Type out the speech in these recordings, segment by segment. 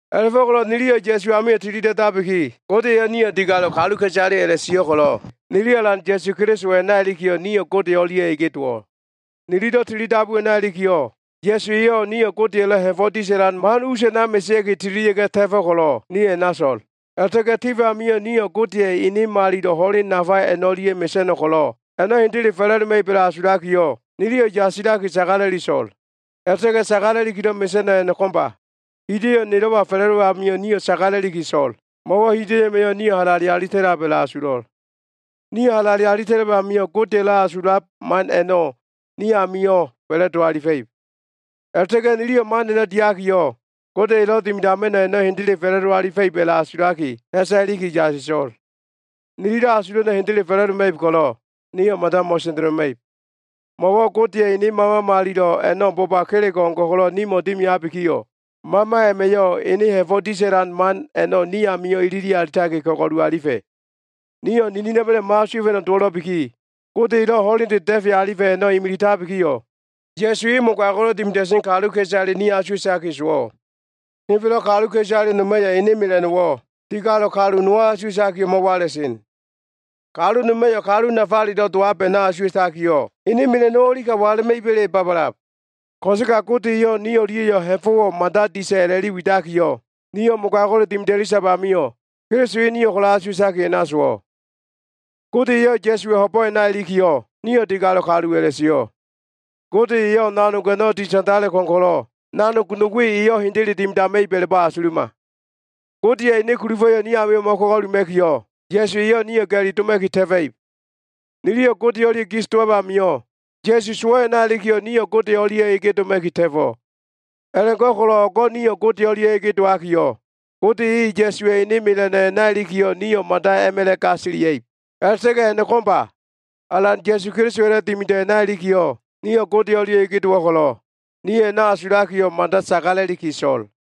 A꞉la꞉fo꞉ko꞉lo꞉ niliyo꞉ Ya꞉su amio꞉ tilida꞉dabiki, Gode eyo꞉ nio꞉ digalo꞉ kaluka꞉isale a꞉la꞉sio꞉ ko꞉lo꞉, nili Alan Ya꞉su Keliso a꞉na ilikiyo꞉, nio꞉ Gode o꞉lia꞉ ege dowo꞉. Nililo꞉ tilidabu a꞉na ilikiyo꞉, Ya꞉su eyo꞉ nio꞉ Godeya꞉lo꞉ ha꞉fo꞉ disa꞉lan man us a꞉na mesea꞉ki tililia꞉ga꞉ ta꞉fo꞉ ko꞉lo꞉, nio꞉ a꞉na so꞉l. A꞉la꞉ta꞉ga꞉ tif amio꞉ nio꞉ Godeya꞉ ene malilo꞉ ho꞉len nafa a꞉no꞉lia꞉ mesa꞉no꞉ ko꞉lo꞉ a꞉no꞉ hendele fa꞉la꞉doma꞉ib a꞉la꞉asulakiyo꞉, niliyo꞉ yasilaki sagala꞉li so꞉l. A꞉la꞉ta꞉ga꞉ sagala꞉likilo꞉ mesa꞉no꞉ a꞉no꞉ ko꞉mba. Hida꞉yo꞉wo꞉ nilo꞉wa fa꞉la꞉dowab amio꞉, nio꞉ sagala꞉liki so꞉l, mo꞉wo꞉ hida꞉yo꞉ a꞉ma꞉yo꞉ nio꞉ halale alita꞉lab a꞉la꞉asulo꞉l. Nio꞉ halale alita꞉lab amio꞉, Godeya꞉lo꞉ asulab man a꞉no꞉ ni amio꞉ fa꞉la꞉do alifa꞉ib. A꞉la꞉ta꞉ga꞉ niliyo꞉ man a꞉no꞉ diakiyo꞉, Gode elo꞉ dimidama꞉no꞉ a꞉no꞉ hendele fa꞉la꞉do alifa꞉ib a꞉la꞉asulaki, ha꞉sa iliki yasiso꞉l. Nililo꞉ asulo꞉ a꞉no꞉ hendele fa꞉la꞉doma꞉ib ko꞉lo꞉, nio꞉ mada mo꞉sendeloma꞉ib. Mo꞉wo꞉ Godeya꞉ ene Mama Malilo꞉ a꞉no꞉ boba kelego꞉ o꞉ngo꞉ ko꞉lo꞉ nimo꞉ dimiabikiyo꞉, Mama a꞉ma꞉yo꞉ ene ha꞉fo꞉ disa꞉lan man a꞉no꞉ ni amio꞉ ilili alitaki ko꞉go꞉lu alifa꞉. Nio꞉ ninina꞉ma꞉la꞉yo꞉ mo꞉asuwa꞉fa꞉no꞉ dowo꞉lo꞉biki, Gode elo꞉ ho꞉lende da꞉fe alifa꞉ a꞉no꞉ imilitabikiyo꞉, Ya꞉su e mogago꞉lo꞉ dimida꞉sen kaluka꞉isale ni asuwa꞉taki sowo꞉. Henfelo꞉ kaluka꞉isale noma꞉yo꞉ ene mela꞉no꞉wo꞉, digalo꞉ kalu nowo꞉ asuwa꞉takiyo꞉ mo꞉wala꞉sen. Kalu noma꞉yo꞉, kalu nafalelo꞉ dowab a꞉no꞉ asuwa꞉takiyo꞉, ene mela꞉no꞉wo꞉ o꞉li ka wala꞉ma꞉iba꞉le babalab. Ko꞉sega Gode eyo꞉ ni o꞉lia꞉yo꞉ ha꞉fo꞉wo꞉ mada disa꞉ a꞉la꞉li widakiyo꞉, nio꞉ mogago꞉le dimida꞉li sab amio꞉, Keliso e nio꞉ ko꞉lo꞉ asuwa꞉taki sowo꞉. Gode eyo꞉ Ya꞉suwa꞉ ho꞉bo꞉ a꞉na ilikiyo꞉, nio꞉ digalo꞉ kalu a꞉la꞉sio꞉. Gode eyo꞉ nanog a꞉no꞉ ditandale ko꞉m ko꞉lo꞉, nanog no we eyo꞉ hendele dimidama꞉ib a꞉la꞉bo꞉ asuluma. Godeya꞉ ene kulufa꞉yo꞉wo꞉ ni amio꞉ mo꞉ko꞉go꞉luma꞉kiyo꞉, Ya꞉su eyo꞉ nio꞉ ga꞉li doma꞉ki ta꞉fa꞉ib. Niliyo꞉ Gode o꞉lia꞉ gis dowab amio꞉, Ya꞉su sowo꞉ a꞉na ilikiyo꞉, nio꞉ Gode o꞉lia꞉ ege doma꞉ki ta꞉fo꞉. A꞉la꞉go꞉ko꞉lo꞉ o꞉go꞉ nio꞉ Gode o꞉lia꞉ ege dowakiyo꞉, Gode eyo꞉ Ya꞉suwa꞉ ene mela꞉no꞉ a꞉na ilikiyo꞉, nio꞉ mada a꞉ma꞉la꞉ gasilia꞉ib. A꞉la꞉ta꞉ga꞉ a꞉no꞉ ko꞉mba! Alan Ya꞉su Kelisowa꞉lo꞉ dimido꞉ a꞉na ilikiyo꞉, nio꞉ Gode o꞉lia꞉ ege dowo꞉ ko꞉lo꞉, nio꞉ a꞉no꞉ asulakiyo꞉, mada sagala꞉liki so꞉l.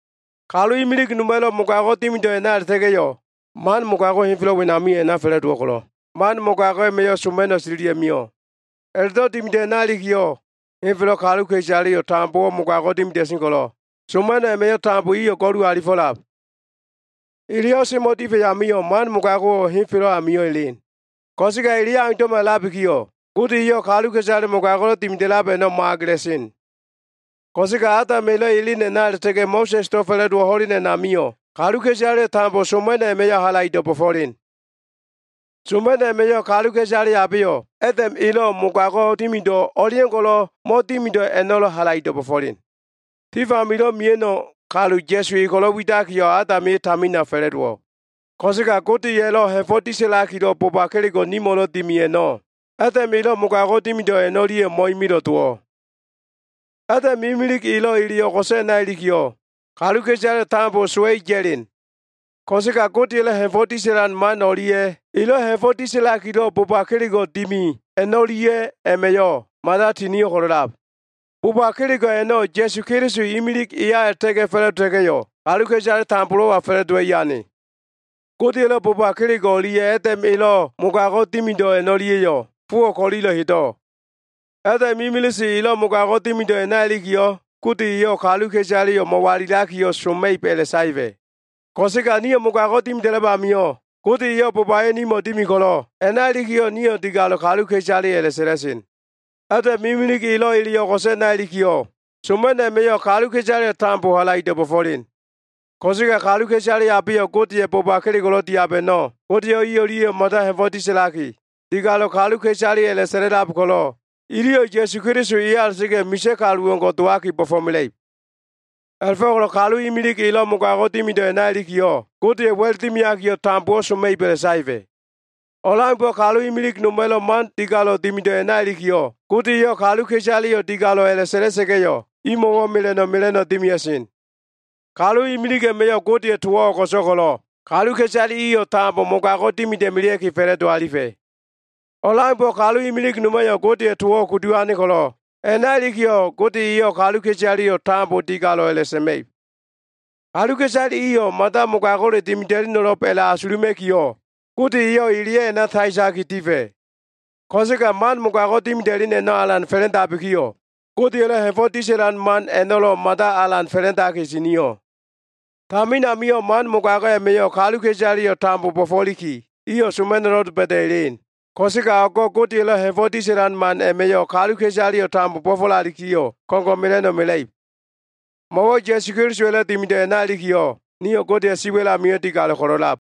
Kalu imilig noma꞉lo꞉ mogago꞉ dimido꞉ a꞉na a꞉la꞉ta꞉ga꞉yo꞉ man mogago꞉wo꞉ henfelo꞉ wenamio꞉ a꞉na fa꞉la꞉dowo꞉ ko꞉lo꞉, man mogago꞉ a꞉ma꞉yo꞉ soma꞉no꞉ tililia꞉ mio꞉. A꞉la꞉do꞉ dimido꞉ a꞉na ilikiyo꞉, henfelo꞉ kaluka꞉isaleyo꞉ tambo mogago꞉wo꞉ dimida꞉sen ko꞉lo꞉, soma꞉no꞉ a꞉ma꞉yo꞉ iyo꞉ tambo go꞉lu alifo꞉lab. Eleyo꞉ semo꞉ difa꞉ amio꞉, man mogago꞉wo꞉ henfelo꞉ amio꞉ elen. Ko꞉sega, eleyo꞉ aundo꞉ma a꞉labikiyo꞉, Gode eyo꞉ kaluka꞉isale mogago꞉lo꞉ dimida꞉lab a꞉no꞉ mo꞉agela꞉sen. Ko꞉sega Adam elo꞉ elen a꞉na a꞉la꞉ta꞉ga꞉ Mo꞉sa꞉sdo꞉ fa꞉la꞉dowo꞉ ho꞉len a꞉namio꞉, kaluka꞉isaleyo꞉ tambo soma꞉no꞉ a꞉ma꞉yo꞉ halaido꞉ bo꞉fo꞉len. Soma꞉no꞉ a꞉ma꞉yo꞉ kaluka꞉isale abeyo꞉ Adam elo꞉ mogago꞉ dimido꞉ o꞉leo꞉ngo꞉lo꞉ mo꞉dimido꞉ a꞉no꞉lo꞉ halaido꞉ bo꞉fo꞉len. Tif amilo꞉ mia꞉no꞉ kalu Ya꞉su e ko꞉lo꞉ widakiyo꞉, Adam e tamina fa꞉la꞉dowo꞉. Ko꞉sega Godeya꞉lo꞉ ha꞉fo꞉ disa꞉lakilo꞉ boba kelego꞉ nimo꞉lo꞉ dimi a꞉no꞉, Adam elo꞉ mogago꞉ dimido꞉ a꞉no꞉lia꞉yo꞉ mo꞉imilo꞉ dowo꞉. Adam imilig elo꞉ ele o꞉go꞉so꞉ a꞉na ilikiyo꞉, kaluka꞉isaleyo꞉ tambo sowa꞉i ya꞉len. Ko꞉sega Godeya꞉ ha꞉fo꞉ disa꞉lan man o꞉lia꞉ elo꞉ ha꞉fo꞉ disa꞉lakilo꞉ boba kelego꞉ dimi a꞉no꞉lia꞉ma꞉yo꞉ mada tinio꞉ ko꞉lo꞉lab. Boba kelego꞉ a꞉no꞉ Ya꞉su Keliso imilig eya a꞉la꞉ta꞉ga꞉ fa꞉la꞉dota꞉ga꞉yo꞉, kaluka꞉isale tambolo꞉wa fa꞉la꞉dowa꞉i ane. Godeya꞉lo꞉ boba kelego꞉ o꞉lia꞉ Adam elo꞉ mogago꞉ dimido꞉ a꞉no꞉lia꞉yo꞉ fowo꞉ ko꞉lilo꞉ hedo꞉. Adam imilise elo꞉ mogago꞉ dimido꞉ a꞉na ilikiyo꞉, Gode eyo꞉ kaluka꞉isaleyo꞉ mo꞉walilakiyo꞉, soma꞉ib a꞉la꞉saefa꞉. Ko꞉sega nio꞉ mogago꞉ dimida꞉lab amio꞉, Gode eyo꞉ bobayo꞉ nimo꞉ dimi ko꞉lo꞉, a꞉na ilikiyo꞉ nio꞉ digalo꞉ kaluka꞉isale a꞉la꞉sa꞉la꞉sen. Adam imilig elo꞉ ele o꞉go꞉so꞉ a꞉na ilikiyo꞉, soma꞉no꞉ man a꞉ma꞉yo꞉ kaluka꞉isaleyo꞉ tambo halaido꞉ bo꞉fo꞉len. Ko꞉sega kaluka꞉isale abeyo꞉ Godeya꞉ boba kelego꞉lo꞉ diab a꞉no꞉, Gode eyo꞉ i o꞉lia꞉yo꞉ mada ha꞉fo꞉ disa꞉laki, digalo꞉ kaluka꞉isale a꞉la꞉sa꞉la꞉lab ko꞉lo꞉, iliyo꞉ Ya꞉su Keliso eya a꞉la꞉ta꞉ga꞉yo꞉ misa꞉ kalu o꞉ngo꞉ dowaki bo꞉fo꞉mela꞉ib. A꞉la꞉fo꞉ko꞉lo꞉ kalu imilig elo꞉ mogago꞉ dimido꞉ a꞉na ilikiyo꞉, Gode eyo꞉ wa꞉l dimiakiyo꞉, tambowo꞉ soma꞉ib a꞉la꞉saefa꞉. O꞉leaumbo꞉ kalu imilig noma꞉lo꞉ man digalo꞉ dimido꞉ a꞉na ilikiyo꞉, Gode eyo꞉ kaluka꞉isaleyo꞉ digalo꞉ a꞉la꞉sa꞉la꞉sa꞉ga꞉yo꞉, imo꞉wo꞉ mela꞉no꞉ mela꞉no꞉ dimia꞉sen. Kalu imilig a꞉ma꞉yo꞉ Godeya꞉ towo꞉ o꞉go꞉so꞉ ko꞉lo꞉, kaluka꞉isaleyo꞉ tambo mogago꞉ dimida꞉melea꞉ki fa꞉la꞉do alifa꞉. O꞉leaumbo꞉ kalu imilig noma꞉yo꞉ Godeya꞉ towo꞉ kudu ane ko꞉lo꞉, a꞉na ilikiyo꞉ Gode eyo꞉ kaluka꞉isaleyo꞉ tambo digalo꞉ a꞉la꞉sa꞉ma꞉ib. Kaluka꞉isale iyo꞉ mada mogago꞉le dimida꞉leno꞉lo꞉b a꞉la꞉asuluma꞉kiyo꞉, Gode eyo꞉ eleyo꞉ a꞉na saetaki difa꞉. Ko꞉sega man mogago꞉ dimida꞉len a꞉no꞉ alan fa꞉la꞉ndabikiyo꞉, Godeya꞉lo꞉ ha꞉fo꞉ disa꞉lan man a꞉no꞉lo꞉ alan mada fa꞉la꞉ndaki tinio꞉. Tamin amio꞉ man mogago꞉ a꞉ma꞉yo꞉ kaluka꞉isaleyo꞉ tambo bo꞉fo꞉liki, iyo꞉ soma꞉no꞉lo꞉ doba꞉da꞉ elen. Ko꞉sega o꞉go꞉ Godeya꞉lo꞉ ha꞉fo꞉ disa꞉lan man a꞉ma꞉yo꞉ kaluka꞉isaleyo꞉ bo꞉fo꞉lalikiyo꞉, ko꞉ngo꞉ mela꞉no꞉ mela꞉ib. Mo꞉wo꞉ Ya꞉su Kelisowa꞉lo꞉ dimido꞉ a꞉na ilikiyo꞉, nio꞉ Godeya꞉ siwa꞉l amio꞉ digalo꞉ ko꞉lo꞉lab.